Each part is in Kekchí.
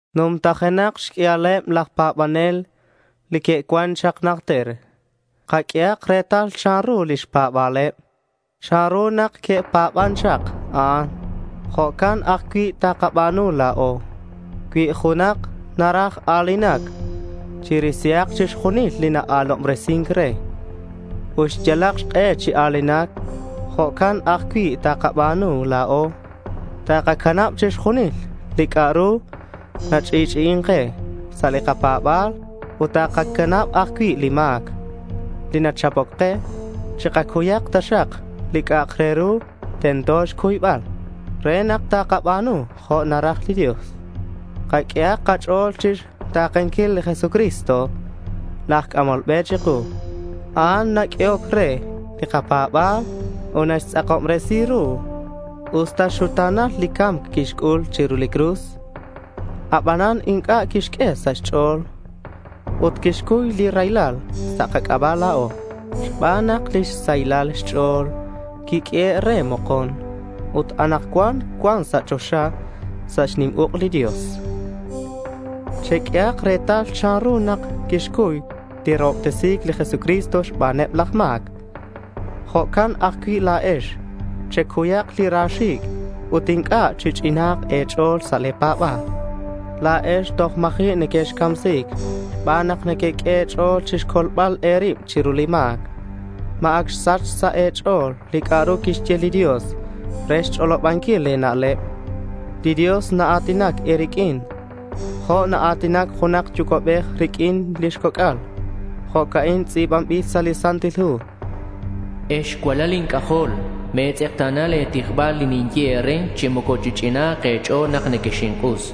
Numtajenak xq'uialeb laj pa̱banel li que'cuan chak najter. Kaq'uehak retal chanru lix pa̱ba̱leb. Chanru nak que'pa̱ban chak a'an, jo'can ajcui' takaba̱nu la̱o. Cui junak naraj a̱linac, narisi chixjunil li naa̱lobresin re ut naxyal xk'e chi a̱linac. Jo'can ajcui' takaba̱nu la̱o. Takacanab chixjunil li c'a'ak re ru nach'i'ch'i'in ke sa' li kapa̱ba̱l ut takacanab ajcui' li ma̱c li nachapoc ke. Chikacuyak taxak li c'a'ak re ru tento xcuybal re nak takaba̱nu jo' naraj li Dios. Kaq'uehak kach'o̱l chixta̱kenquil li Jesucristo laj c'amol be chiku. A'an naq'uehoc re li kapa̱ba̱l ut naxtz'akobresi ru. Usta xuta̱nal li ca̱mc quixc'ul chiru li cruz, abanan inc'a' quixq'ue sa' xch'o̱l. Ut quixcuy li raylal sa' kac'aba' la̱o xban nak lix sahilal xch'o̱l quiq'uehe' re mokon. Ut anakcuan cuan sa' choxa sa' xnim uk' li Dios. Cheq'uehak retal chanru nak quixcuy li rahobtesi̱c li Jesucristo xbaneb laj ma̱c. Jo'can ajcui' la̱ex. Checuyak li ra xi̱c' ut inc'a' chich'ina̱nk e̱ch'o̱l sa' le̱ pa̱ba̱l. La̱ex toj ma̱ji' nequexcamsi̱c xban nak nequeq'ue e̱ch'o̱l chixcolbal e̱rib chiru li ma̱c. ¿Ma ac xsach sa' e̱ch'o̱l li c'a'ru quixye li Dios re xch'olobanquil le̱ na'leb? Li Dios naa̱tinac e̱riq'uin jo' naa̱tinac junak yucua'bej riq'uin lix coc'al. Jo'ca'in tz'i̱banbil sa' li Santil Hu: Ex cualal inc'ajol, me̱tz'ekta̱na le̱ tijbal li ninye e̱re, chi moco chich'ina̱nk e̱ch'o̱l nak nequexink'us.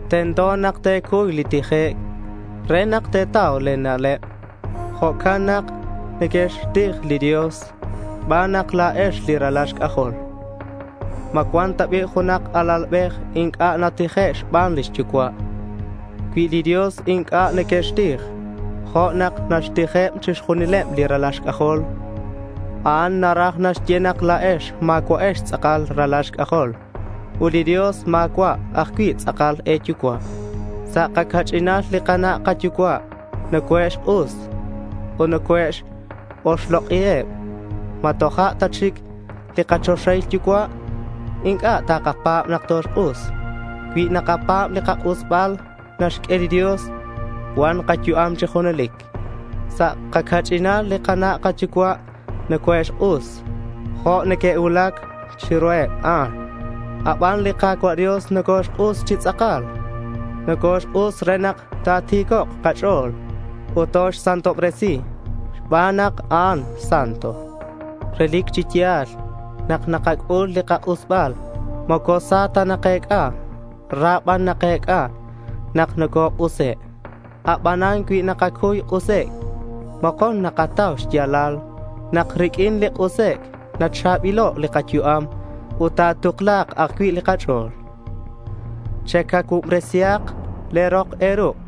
Tento nak te̱cuy li tijec' re nak te̱tau e̱na'leb. Jo'can nak nequexxtij li Dios xban nak la̱ex li ralal xc'ajol. ¿Ma cuan ta bi' junak alalbej inc'a' natije' xban lix yucua'? Cui li Dios inc'a' nequextij jo' nak naxtijeb chixjunileb li ralal xc'ajol, a'an naraj naxye nak la̱ex ma̱cua'ex tz'akal ralal xc'ajol. Ut li Dios ma̱cua' ajcui' tz'akal e̱yucua'. Sa' kaca'ch'inal, li kana' kayucua' nocoe'xk'us ut naka-oxlok'iheb. ¿Ma toja' ta chic li kachoxahil yucua' inc'a' takapa̱b nak toxk'us? Cui nakapa̱b li kak'usbal naxq'ue li Dios, cua̱nk kayu'am chi junelic. Sa' kaca'ch'inal li kana' kayucua' nocoe'xk'us jo' neque'cuulac chiruheb a'an. Aban li Ka̱cua' Dios nocoxk'us chi tz'akal. Nocoxk'us re nak ta̱ti̱cok' kach'o̱l ut toxsantobresi xban nak a'an santo. Relic chi ya̱l nak nakac'ul li kak'usbal moco sa ta nakec'a. Ra ban nakec'a nak nocok'use'. Abanan cui nakacuy k'usec' mokon nakatau xya̱lal nak riq'uin li k'usec' nacha̱bilo' li kayu'am ut ta̱tukla̱k ajcui' li kach'o̱l. Checacuubresihak le̱ rok e̱ruk'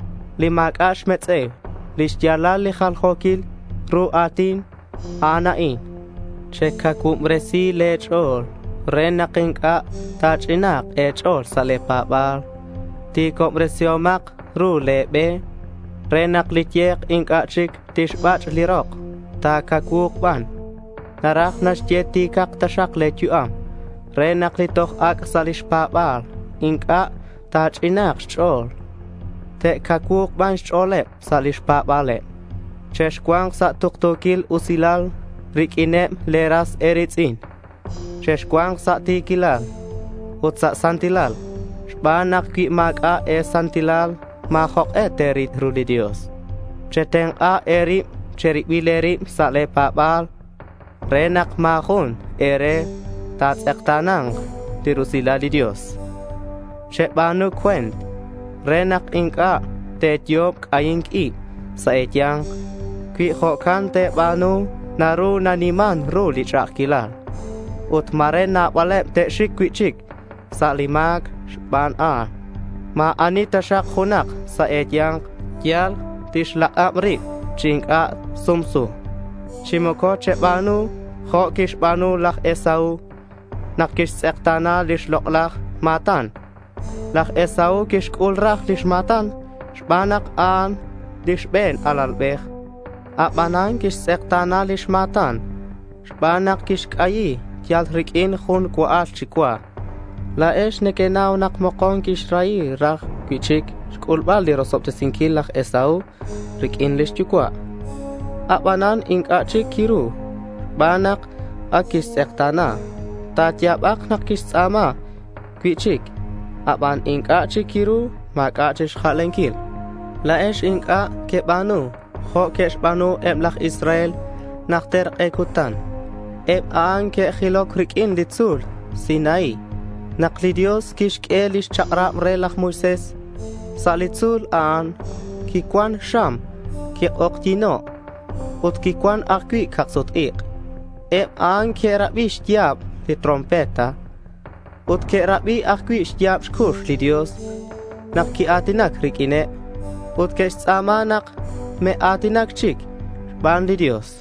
li ma̱c'a' xmetz'e̱u. Lix ya̱lal li jaljo̱quil ru a̱tin a'an a'in: Checacuubresi le̱ ch'o̱l re nak inc'a' ta̱ch'ina̱nk e̱ch'o̱l sa' le̱ pa̱ba̱l. Ti̱cobresihomak ru le̱ be re nak li ye̱k inc'a' chic tixbach' li rok; ta̱cacuu̱k ban. Naraj naxye: ti̱cak taxak le̱ yu'am re nak li toj ac' sa' lix pa̱ba̱l inc'a' ta̱ch'ina̱nk xch'o̱l. Te'cacuu̱k ban xch'o̱leb sa' lix pa̱ba̱leb. Chexcua̱nk sa' tuktu̱quil usilal riq'uineb le̱ ras e̱ri̱tz'in. Chexcua̱nk sa' ti̱quilal ut sa' santilal, xban nak cui ma̱c'a' e̱santilal ma̱ jok'e te̱ril ru li Dios. Chetenk'a e̱rib che̱ribil e̱rib sa' le̱ pa̱ba̱l re nak ma̱ jun e̱re ta̱tz'ekta̱na̱nk li rusilal li Dios. Cheba̱nu cue̱nt re nak inc'a' te̱yo'ob li c'ahi̱nc ib sa' e̱ya̱nk. Cui jo'can te̱ba̱nu naru naniman ru li ch'a'ajquilal ut ma̱re nabaleb te'xic cui'chic sa' li ma̱c xban a'an. Ma̱ ani taxak junak sa' e̱ya̱nk yal tixlak'ab rib chi inc'a' sumsu. Chi moco cheba̱nu jo' quixba̱nu laj Esaú nak quixtz'ekta̱na lix lok'laj ma̱tan. Laj Esaú quixc'ul raj lix ma̱tan xban nak a'an li xbe̱n alalbej. Abanan quixtz'ekta̱na lix ma̱tan xban nak quixc'ayi yal riq'uin jun cua'al chi cua. La̱ex nequenau nak mokon quixrahi raj cui'chic xc'ulbal li rosobtesinquil laj Esaú riq'uin lix yucua'. Abanan inc'a' chic quiru xban nak ac quixtz'ekta̱na. Ta̱ya̱bak nak quixtz'a̱ma cui'chic, aban inc'a' chic quiru. Ma̱c'a' chic xjalenquil. La̱ex inc'a' queba̱nu jo' que'xba̱nu eb laj Israel najter k'e cutan. Eb a'an que'jiloc riq'uin li tzu̱l Sinaí nak li Dios quixq'ue lix chak'rab re laj Moisés sa' li tzu̱l a'an. Quicuan xam. Quik'ojyi̱no' ut quicuan ajcui' cak-sut-ik'. Eb a'an que'rabi xya̱b li trompeta ut que'rabi ajcui' xya̱b xcux li Dios nak quia̱tinac riq'uineb. Ut que'xtz'a̱ma nak me'a̱tina̱c chic xban li Dios.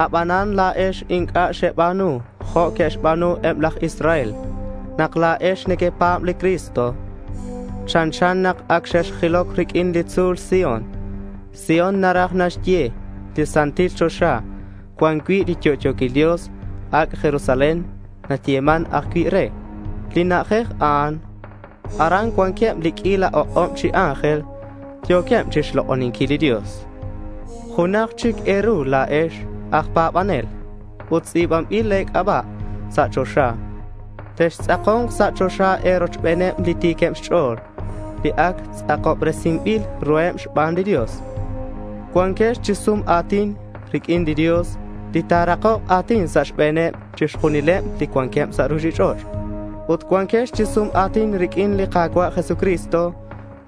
Abanan la̱ex inc'a' xeba̱nu jo' que'xba̱nu eb laj Israel. Nak la̱ex nequepa̱b li Cristo, chanchan nak ac xexjiloc riq'uin li tzu̱l Sión. Sión naraj naxye li santil choxa cuan cui' li yo'yo̱quil Dios. Ac' Jerusalén nayeman ajcui' re li na'ajej a'an. Aran cuanqueb li q'uila ok'ob chi ángel. Yo̱queb chixlok'oninquil li Dios. Junaj chic e̱ru la̱ex aj pa̱banel. Ut tz'i̱banbil le̱ c'aba' sa' choxa. Textz'ako̱nk sa' choxa e̱rochbeneb li ti̱queb xch'o̱l li ac tz'akobresinbil ruheb xban li Dios. Cuanquex chi sum a̱tin riq'uin li Dios li ta̱rakok a̱tin sa' xbe̱neb chixjunileb li cuanqueb sa' ruchich'och'. Ut cuanquex chi sum a̱tin riq'uin li Ka̱cua' Jesucristo,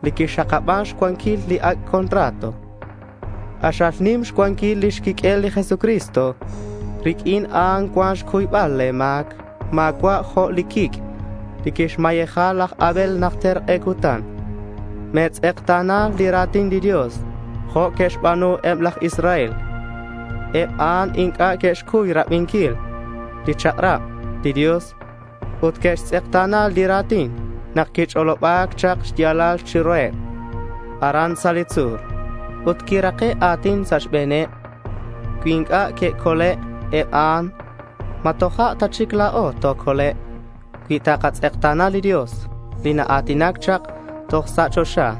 li quixakaban xcuanquil li ac' contrato. K'axal nim xcuanquil lix quiq'uel li Jesucristo. Riq'uin a'an cuan xcuybal le̱ ma̱c. Ma̱cua' jo' li quic' li quixmayeja laj Abel najter k'e cutan. Me̱tz'ekta̱na li ra̱tin li Dios jo' que'xba̱nu eb laj Israel. Eb a'an inc'a' que'xcuy rabinquil xchak'rab li Dios ut que'xtz'ekta̱na li ra̱tin nak quich'oloba̱c chak xya̱lal chiruheb aran sa' li tzu̱l. Ut quirake' a̱tin sa' xbe̱neb. Cui inc'a' que'cole' eb a'an, ¿ma toja' ta chic la̱o tocolek' cui takatz'ekta̱na li Dios li naa̱tinac chak toj sa' choxa?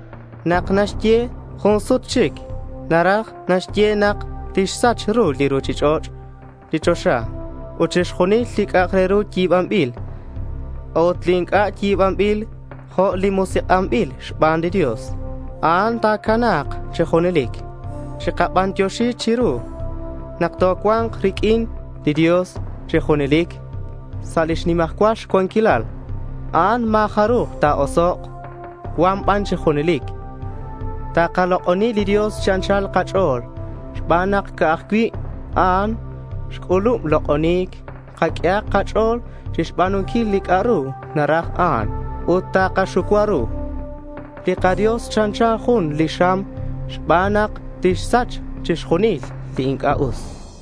Nak naxye “jun sut chic” naraj naxye nak tixsach li ruchich'och', li choxa, ut chixjunil li c'a'ak re ru yi̱banbil. A'ut li inc'a' yi̱banbil, jo' li musik'anbil xban li Dios, a'an ta̱cana̱k chi junelic. Chikabantioxi chiru nak tocua̱nk riq'uin li Dios chi junelic sa' lix nimajcual cuanquilal. A'an ma̱ jaruj ta̱osok'. Cua̱nk ban chi junelic. Takalok'oni li Dios chi anchal kach'o̱l xban nak ca'aj cui' a'an xc'ulub lok'oni̱c. Kaq'uehak kach'o̱l chixba̱nunquil li c'a'ru naraj a'an ut takaxucua ru. Li kaDios chanchan jun li xam xban nak tixsach chixjunil li inc'a' us.